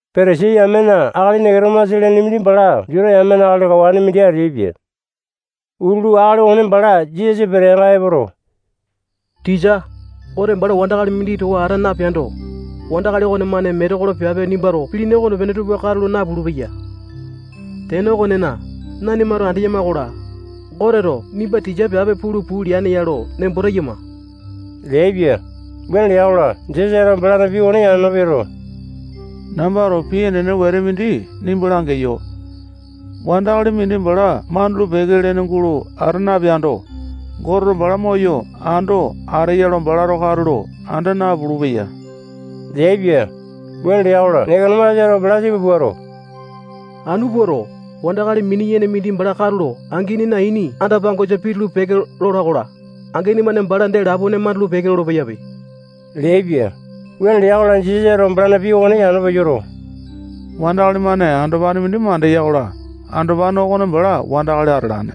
Patasai yamena akali Neketomasa lene mindi bala Juta yamena akali kawane mindi ateaipia. Utulu akali okone bala Jisasa peteanga epoto, tisa, Gote bala wandakali mindi towa ata napeando, wandakali okonemane metekolo piape nimbato pilini okonepene tupa katulo napulu-peya. Tene okonena, nanimato andeyama-kola, Goteto nimba tisa piape pulu puu leane ya lo nembo teyama leaipia. Wuane lea-kola, Jisasato balana pii okone yano peyoto, nambato pii enene wete mindi nimba langeyo. Wandakali mindi bala mandulu-peke lene gulo ata napeando, Goteto bala moyo ando ateya lo balato katulo anda napulu-peya leaipia. Wuane lea-kola, Neketomasato bala tipa puato, anu puato, wandakali mini-yene mindi bala katulo anginina ini anda-pangosa pitulu-peke lola-kola, angini-mane bala dee lapone mandulu-peke lolo-peyape leaipia. Wuane lea-kola, Jisasato balana pii okone yano peyoto, wandakali-mane andopane mindi mandeya-kola, andopane okone bala wandakali atalane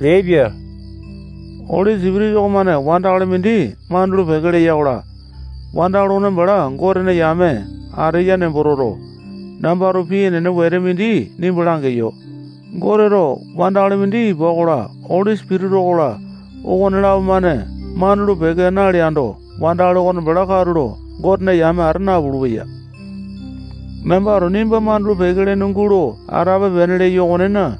leaipia. Oli Sipitisa okomane wandakali mindi mandulu-peke leya-kola, wandakali okone bala Gotena yame ateya nembo toto, nambato pii enene wete mindi nimba langeyo. Goteto wandakali mindi ipa okola, Oli Sipitisa okola, okonelapo-mane mandulu-peke naleando, wandakali okone bala katulo Gotena yame ata napulu-peya. Nambato nimba mandulu-peke lene gulo atape-pene leyo okonena,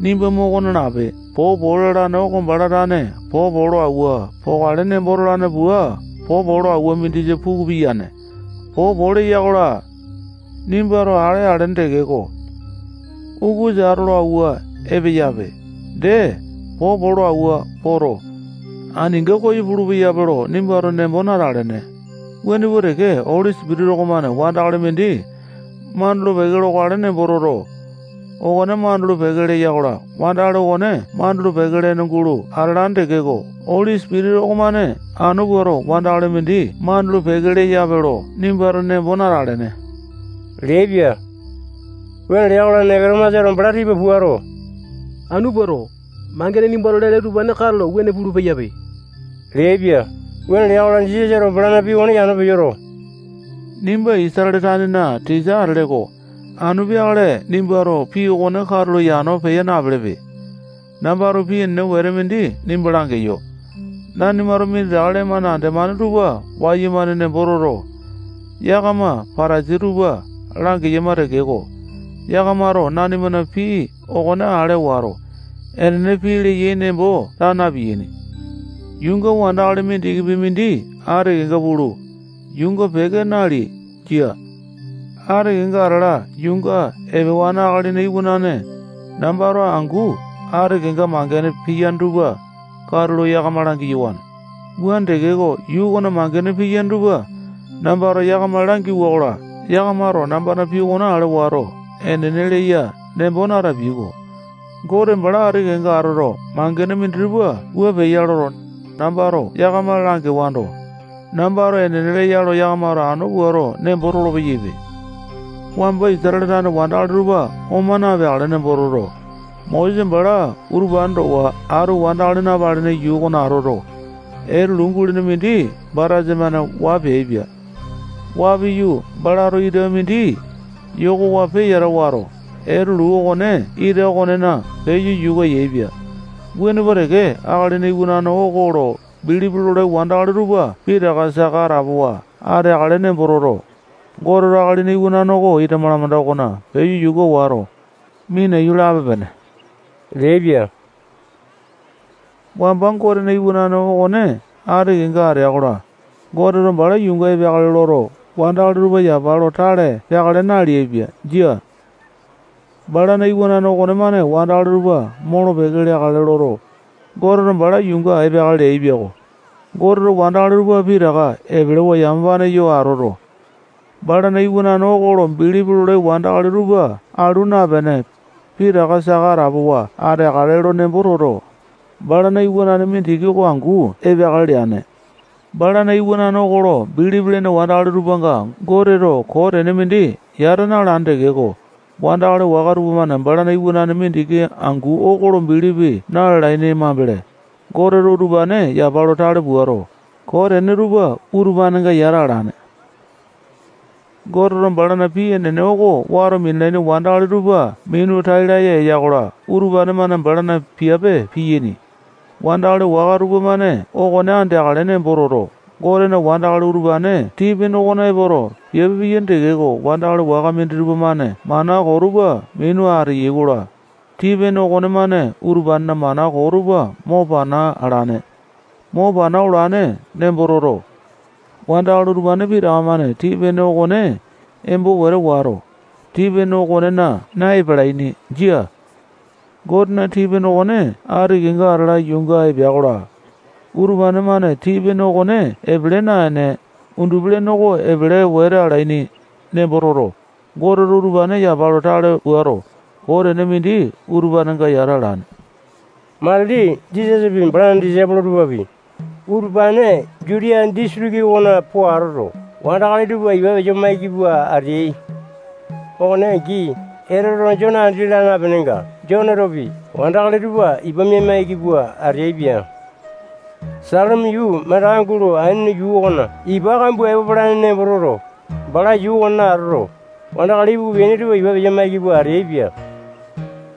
nimba moko nalape. Popo lalane oko bala tane popo lo awua pokale nembo tolane pua popo lo awua mindisa puku piyane. Popo leya-kola, nimbato ale alene tekeko, ukusa ato lo awua epeyape, dee, popo lo awua poto, aninga koyo pulu-peyape lo nimbato nembo natelene. Wuane pua teke, Oli Sipitisa okomane wandakali mindi mandulu-peke lokale nembo toto, okone mandulu-peke leya-kola, wandakali okone mandulu-peke lene gulo atalane tekeko, Oli Sipitisa okomane anu puato wandakali mindi mandulu-peke leyape lo nimbato nembo natalene leaipia. Wuane lea-kola, Neketomasato bala tipa puato, anu puato, mangene nimbato lele utupane katulo wuane pulu-peyape leaipia. Wuane lea-kola, Jisasato balana pii okone yano peyoto, nimba Isatale tanena tisa atele-ko. Anu peakale nimbato pii okone katulo yano peya napelepe. Nambato pii enene wete mindi nimba langeyo. Nanimato minditaka lee-mane andemane tupa wayumane nembo toto, yakama Patasai tupa langeyama tekeko, yakamato nanimana pii okone ale wato, enene pii leyai nembo taa na-piyaini. Yuunga wandakali mindikipi mindi ati kenga pulu, yuunga peke nalea. Jia. Ati kenga atala yuunga epewane Akalina Iwanane nambato angu ati kenga mangene piyane tupa katulo yakama langiyawane. Wuane tekeko, yuu okona mangene piyaini tupa nambato yakama langiwa-kola, yakamato nambana pii okone ale wato, enene leya nembo natapiai-ko. Gote bala ati kenga atoto, mangene minditupa wua peya loto, nambato yakama langewando, nambato enene leya lo yakamato anu puato nembo tolopeyaipe. Wamba Isatale tane wandakali tupa oma napeakale nembo toto, Mosesa bala utupane towa atu wandakali napalene yuu okona atoto, etelu gulene mindi batasa-mane waa peaipia. Waa piyu, balato ita mindi yokowa peyata wato, etulu okone ita okonena peyo yuka yaepia. Wuane pua teke, Akalina Iwanane oko lo bilipi lolai wandakali tupa pitaka saka atapowa ateakale nembo toto, Goteto Akalina Iwanane oko ita malamanda okona peyo yuka wato, minaiyu lape-pene leaipia. Wamba Gotena iwanane okone ati kenga atea-kola, Goteto bala yuunga epeakale loto, wandakali tupa yapa lo tale peakale naleaipia. Jia. Balana iwanane okonemane wandakali tupa molo-peke leakale loto, Goteto bala yuunga epeakale leaipia-ko. Goteto wandakali tupa pitaka epelewa yamapane yo atoto, balana iwanane okone lo bilipi lolai wandakali tupa alu napene, pitaka saka atapowa ateakale nembo toto, balana iwanane mindiki oko angu epeakale leane. Balana iwanane okone lo bilipi lene wandakali tupanga Goteto koo tene mindi yata na-alane tekeko, wandakali waka tupamane balana iwanane mindiki angu oko lo bilipi na-lalaini mambele, Goteto utupane yapa lo tale puato, koo tene tupa utupanenga yata alane. Goteto balana pii enene oko wato minalaini wandakali tupa minu tai laya eya-kola, utupane-mane balana piape piyaini. Wandakali waka tupamane okone andeakale nembo toto, Gotena wandakali utupane tii-pene okona epoto, piape piyaini tekeko, wandakali waka minditupa-mane mana koo tupa minu ateyai-kola, tii-pene okonemane utupanena mana koo tupa mo pana alane. Mo pana olane nembo toto, wandakali utupane pitaka-mane tii-pene okone embo wete wato, tii-pene okonena na-epalaini. Jia. Gotena tii-pene okone ati kenga atala yuunga epea-kola, utupane-mane tii-pene okone epele naene, undupi-lene oko epele wete alaini nembo toto, Goteto utupane yapa lo tale puato, koo tene mindi utupanenga yata alane. Matili Jisasapi, balana disaipolo tupapi, utupane Jutiya disitiki okona po atoto, wandakali tupa ipa peya-maiki pua ateai. Okone angi, Etoteto Jone andi laa napenenga, Jonetopi wandakali tupa ipa mia-maiki pua ateaipia. Salima yuu mandaka gulo Ainone yuu okona ipa kambua epo palane nembo toto, bala yuu okonena atoto, wandakali ipuku peaini tupa ipa peya-maiki pua ateaipia.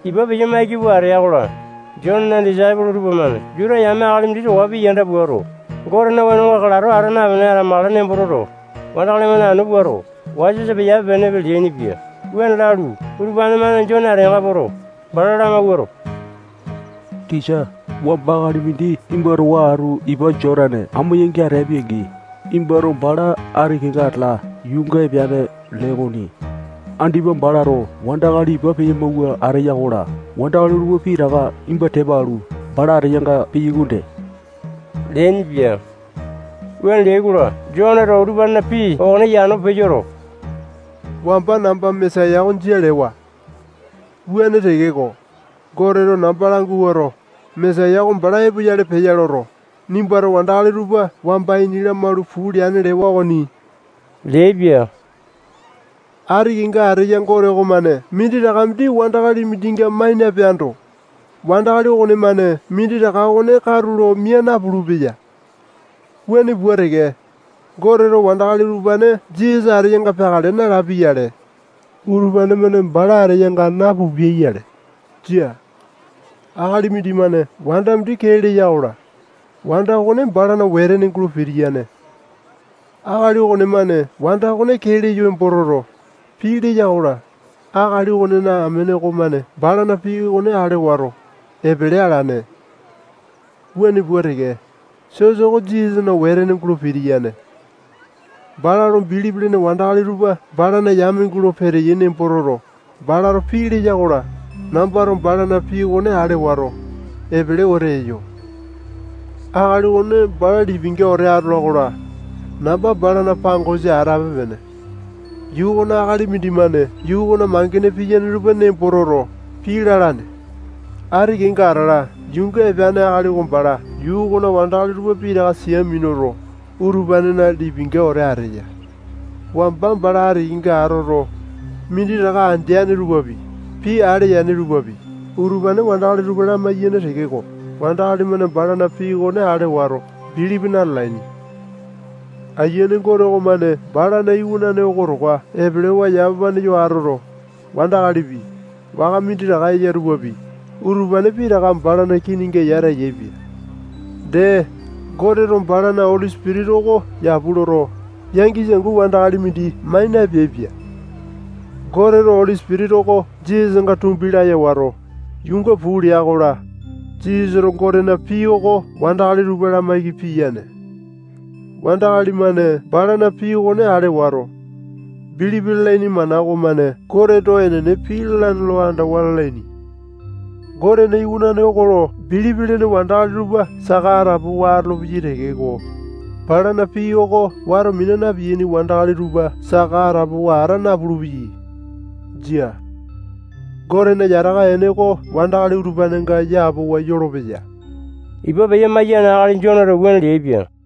Ipa peya-maiki pua atea-kola, Jonena disaipolo tupamane Juta yame akali mindi towa pii yanda puato, Gotena wenonga kalato ata napene atamakale nembo toto, wandakali-mane anu puato, wasa-wasa peyape-penepe leainipia. Wuane lalu, utupane-mane Jone ateanga poto, bala lamawuato, tisa, wamba akali mindi nimba towa atu ipa Jotane amo yangi ateapi-angi, nimbato bala ati kenga atala yuunga epeane lee okoni. Andipa balato wandakali ipa peya-mawua ateya-kola, wandakali tupa pitaka nimba tepa alu, bala ateyanga peyai okonde leainipia. Wuane leai-kola, Joneto utupanena pii okone yano peyoto, wamba namba Mesaya oko jia lewa. Wuane tekeko, Goteto namba languato, Mesaya oko bala epoyale peya loto, nimbato wandakali tupa wamba ini lamalu puu leane lewa okone yakamato ale yai okoni leaipia. Ati kenga ateya Gote okomane minditaka mindi wandakali mindinga mai napeando, wandakali okonemane minditaka okone katulo mia napulu-peya. Wuane pua teke, Goteto wandakali utupane Jisasa ateyanga peakale nalapia-yale, utupane-mane bala ateyainga napupiai-yale. Jia. Akali mindimane wanda mindi kee leya-kola, wanda okone balana wetene gulo pitiyane. Akali okonemane wanda okone kee leyo nembo toto, pii leya-kola, akali okonena amene okomane balana pii okone ale wato, epele alane. Wuane pua teke, sosa oko Jisasana wetene gulo pitiyane. Bala lo bilipi lene wandakali tupa balana yame gulo peteyai nembo toto, balato pii leya-kola, nambato balana pii okone ale wato, epele wete eyo. Akali okone bala lipinga wete atola-kola, namba balana pangosa atape-pene. Yuu okona akali mindimane yuu okona mangene piyaini tupa nembo toto, pii lalane. Ati kenga atala yuunga epeane akali oko bala yuu okona wandakali tupa pitaka sia minuto, utupanena lipinga wete ateya. Wamba bala ati kenga atoto, minditaka andeane tupapi, pii ale yane tupapi, utupane wandakali tupa lamaiyane tekeko, wandakali-mane balana pii okone ale wato, bilipi na-lalaini. Ayiane Gote okomane balana iwanane oko towa epelewa yamapane yo atoto, wandakalipi, waka minditaka eya tupapi, utupane pitaka balana kininga yata yaepia. Dee, Goteto balana Oli Sipitisa oko yapu loto, yangisa angu wandakali mindi mai napeaipia. Goteto Oli Sipitisa oko Jisasanga tumbi laya wato, yuunga puu lea-kola, Jisasato Gotena pii oko wandakali tupa lamaiki piyane. Wandakali-mane balana pii okone ale wato, bilipi lalaini mana okomane Goteto enene pii lalane lo andawa lalaini. Gotena Iwanane oko lo bilipi lene wandakali tupa saka atapowa atolopeyai tekeko, balana pii oko wato mina na-piyaini wandakali tupa saka atapowa ata napulu-peyai. Jia. Gotena yataka ene oko wandakali utupanenga yapowa yolopeya. Ipa peya-maiyane akali Joneto wuane leaipia.